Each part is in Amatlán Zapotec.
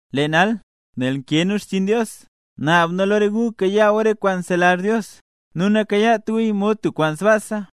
Lee nal, nel nkee nu xchiin Dios, naab nu lo re gu kayaa gu re kwaan nzelazh Dios, nu nakayaat guya mod tub kwaan sbaasa.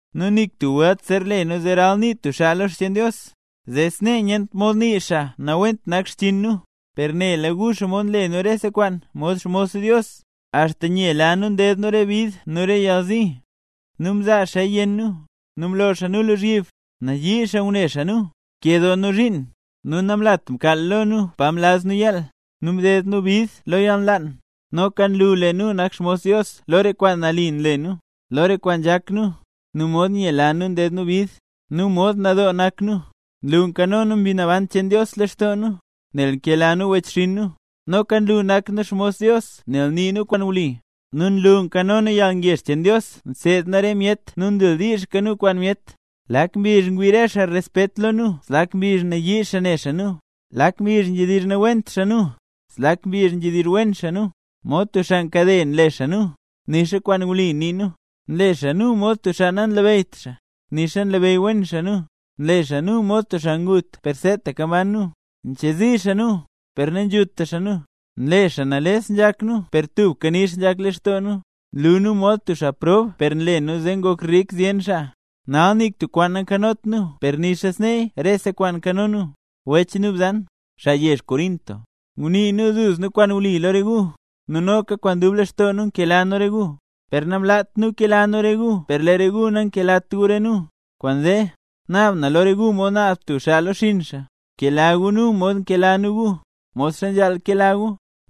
Nu nik tub welt zer le nu zee ralnii tub xaa lo xcheen Dios, zee snee nyent mod nii xaa nawent nak xchiin nu. Per nela gu xomod nle nu rese kwaan mod xmos Dios, axta nyela nu nded nu re bid nu re yalzi, nu mzaa xaaya yenn nu, mlo xaa nu lozhyib, nayii xaa ngune xaa nu, mkee doo nu zhiin, nu namlat mkaal lo nu pa mlaz nu yaal, nu mded nu bid lo yalnlaan. Noka nlu lee nu nak xmos Dios lo re kwaan nali nle nu, lo re kwaan nzhak nu, nu mod nyela nu nded nu bid, nu mod nadoo nak nu, nlu nzho Mbi Naban cheen Dios lextoo nu, nel nkela nu wechxinn nu. Noka nlu nak nu xmos Dios nel nii nu kwaan wli, nu nlu nkano nu yalngezh cheen Dios nseed nu re myet nu ndildiizhka nu kwaan myet. Lak mbizh ngwii re xaa respet lo nu zlak mbizh nayii xaa ne nu, lak mbizh nzhedizh nawent xaa nu, zlak mbizh nzhedizh wen xaa nu. Mod tub xaa nkade nle xaa nu, nixa kwaan wli nii nu. Nle xaa nu mod tub xaa nanlabeyyt xaa, nixa nlabeyy wen xaa nu. Nle xaa nu mod tub xaa ngut per seetaka mban nu; nchezi xaa nu, per nanzhuta xaa nu. Nle xaa nales nzhak nu per tubka nix nzhak lextoo nu; nlu nu mod tub xaa prob per nle nu zee ngok rik zyen xaa; nal nik tub kwaan nankanot nu per nixa sneeya rese kwaan nkano nu. Wech nu bzan, xaa yezh Corinto, ngunii nu duzna kwaan wli lo re gu, nu noka kwaan dub lextoo nu nkela nu re gu. Per namlaat nu kela nu re gu per lee re gu nankelat gu re nu. Kwaanzee, naab na lo re gu mod naab tub xaa lo xinn xaa, bkela gu nu mod nkela nu gu, modxa nzhaal kela gu.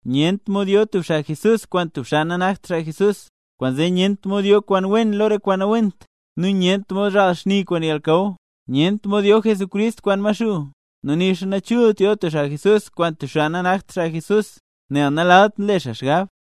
Nyent mod yo tub xaa Jesús kwaan tub xaa nanakt xaa Jesús, kwaanzee nyent mod yo kwaan wen lo re kwaan nawent, nu nyent mod zhaal xni kwaan yalnakaw. Nyent mod yo Jesucrist kwaan Maxuu, nu nixa nachult yo tub xaa Jesús kwaan tub xaa nanakt xaa Jesús, nel nalalt nle xaa xgab.